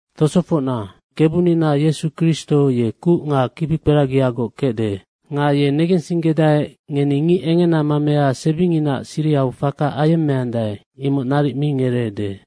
Tosofocna, Kebunina Yesu Kristo ye kuc nga kibikperagiagoc kecde. Nga ye negensinggedae, ngeni ngic engena mamea sebinginaac sirihau faka ayemmeandae, imoc naric mi ngereede.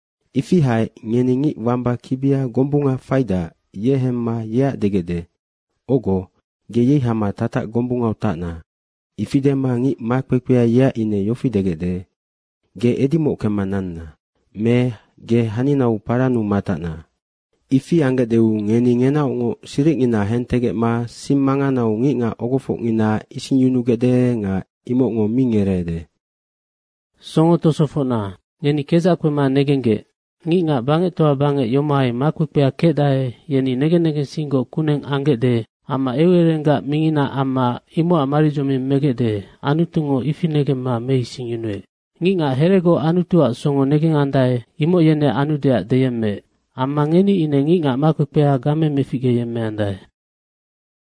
Ifi haec ngeni ngic wamba kibia gombunga faidac, ye hemma yeac degecde, “Ogo, ge yei hama tatac gombungau tacna.” Ifi dema ngic makpekpea yeac ine yofi degecde, “Ge edimoc kemma nanna.” me “Ge haninau parannu matacna.” Ifi anggecdeu ngeni ngenaocngoc siricngina hentegecma sing manganau ngicngac ogofocngina isingyunugecde nga imocngo mi ngereede. Songo tosofocna, ngeni kedzac kpema negenggec, ngicngac bangectoa bangec yomohai makpekpea kecdae, yeni negen negensinggoc kuneng anggecde amma eucererenggac mingina amma imocac maridzoming megecde, Anutungo ifi negemma meisingyunuec. Ngicngac heregoc Anutuac songo negengandae, imoc yeneac anudeac deyemmeec. Amma ngeni ine ngicngac makpekpea game meficgeyemmeandae.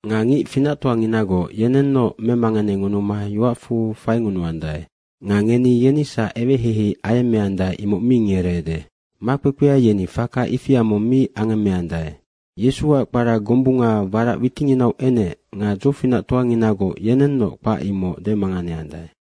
Nga ngic finactoanginagoc yenennoc memanganengunuma yoacfu faingunuandae. Nga ngeni yenisac eweheihei ayemmeandae, imoc mi ngereede. Makpekpea yeni faka ifia mong mi angemmeandae. Yesuac kpara gombunga warac witinginau enec nga dzofinactoanginagoc yenennoc kpac imoc demanganeandae.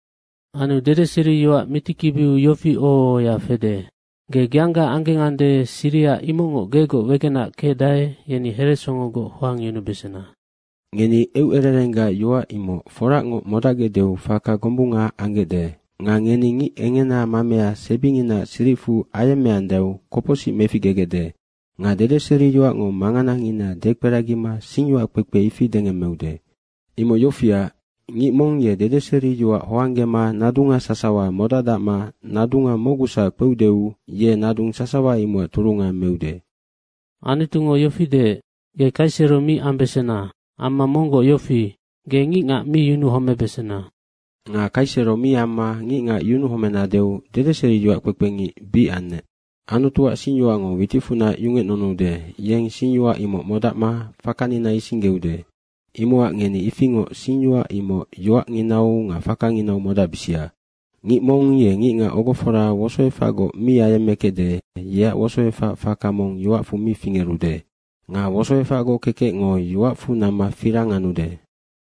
Anu dedeseriyoac mitikibiu yofi oho ohoya fede, “Ge geangga anggengande, siriha imocngoc gegoc wegena kecdae, yeni heresongogoc hoangyunubesena.” Ngeni eucererenggac yoac imoc foracngoc modacgecdeu faka gombunga anggecde. Nga ngeni ngic engena mamea sebinginaac siricfu ayemmeandaeu kopocsic meficgegecde. Nga dedeseriyoacngo manganangina dekperagima singyoac kpekpe, ifi dengemmeude. Imoc yofiac, ngic mong ye dedeseriyoac hoanggema nadunga sasawa modacdacma nadunga mocgusac kpeudeu, ye nadung sasawa imocac turunga meude. Anutungo yofi deec, “Ge kaisero mi ambesena.” amma monggoc yofi, “Ge ngicngac mi yunuhomebesena.” Nga kaisero mi amma ngicngac yunuhomenadeu dedeseriyoac kpekpengic bic annec. Anutuac singyoacngo witicfunac yungecnunuude, yeng singyoac imoc modacma fakanina isinggeude. Imocac ngeni ifingoc singyoac imoc yoacnginau nga fakanginau modacbisia. Ngic mong ye ngicngac ogofora wosoefacgoc mi ayemmekecde, yeac wosoefac faka mong yoacfu mi fingerude. Nga wosoefacgoc kekecngo yoacfu namma firang anude.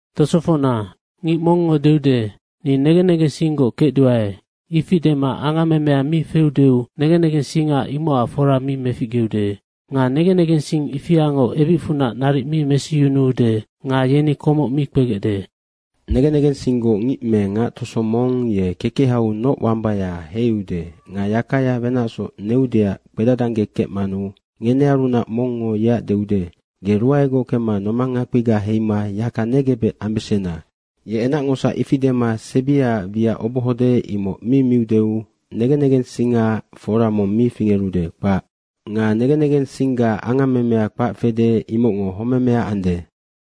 Tosofocna, ngic mongngo deude, “Ni negen negensinggoc kecduae.” ifi dema angammemea mi feudeu negen negensinga imocac fora mi meficgeude. Nga negen negensing ifiango ebicfunac naric mi mesiyunuude nga yeni komoc mi kpegecde. Negen negensinggoc ngic me ngac toso mong ye kekehau noc wambaya heiude nga yakaya wenacsoc neudeac kpedadanggekecmanu ngenearunac mongngo yeac deude, “Ge ruaegoc kemma nomang ngakpiga heima yaka negebec ambesena.” ye enacngosac ifi dema sebiaac wiac obohode, imoc mi miudeu, negen negensingaac fora mong mi fingerude, kpac. Nga negen negensingga angammemea kpac fede, imocngo homemea ande.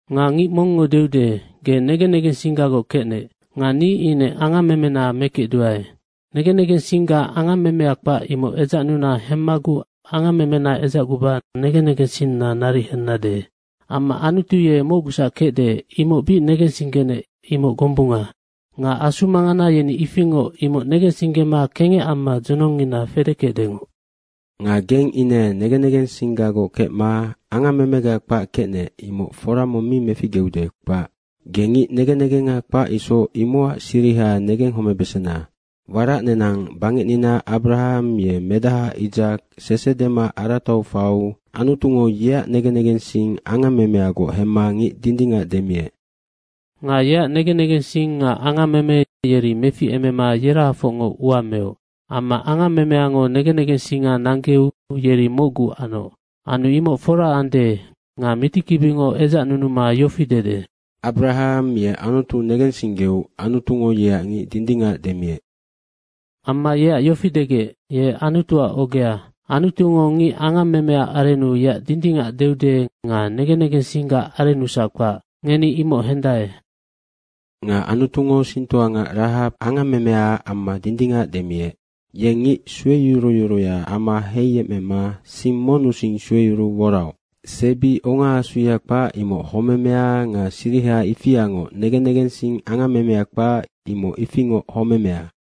Nga ngic mongngo deude, “Ge negen negensinggagoc kecnec. Nga ni ine angammemena mekecduae. Negen negensingga angammemea kpac, imoc edzacnuna hemmaguc angammemena edzacguba negen negensinna naric hennade.” Amma Anutu ye mocgusac kecde, imoc bic negensinggenec, imoc gombunga. Nga asu mangana yeni ifingoc imoc negensinggema kengec amma dzonongngina fedekecdengoc. Nga geng ine negen negensinggagoc kecma angammemega kpac kecnec, imoc fora mong mi meficgeude, kpac. Ge ngic negen negengga kpac isoc, imocac siriha negenghomebesena. Warac nenang bangecnina Abarahang ye medaha Isaka sese dema aratau faiu Anutungo yeac negen negensing angammemeagoc hemma ngic dindingac demiec. Nga yeac negen negensing nga angammeme yeri meficemema yerahafocngoc ua meoc. Amma angammemeango negen negensinga nanggeu yeri mocgu anoc. Anu imoc fora ande nga mitikibingo edzacnunuma yofi dede, “Abarahang ye Anutu negensinggeu Anutungo yeac ngic dindingac demiec.” Amma yeac yofi degec, “Ye Anutuac ogea.” Anutungo ngic angammemea arennu yeac dindingac deude nga negen negensinggac arennusac kpac, ngeni imoc hendae. Nga Anutungo singtoangac Rahaba angammemeaac amma dindingac demiec. Yeng ngic sueyuruyuruya ama heiyemecma sing monnusing sueyuruu woraoc. Sebi ongaasuya kpac, imoc homemea nga siriha ifiangoc negen negensing angammemea kpac, imoc ifingoc homemea.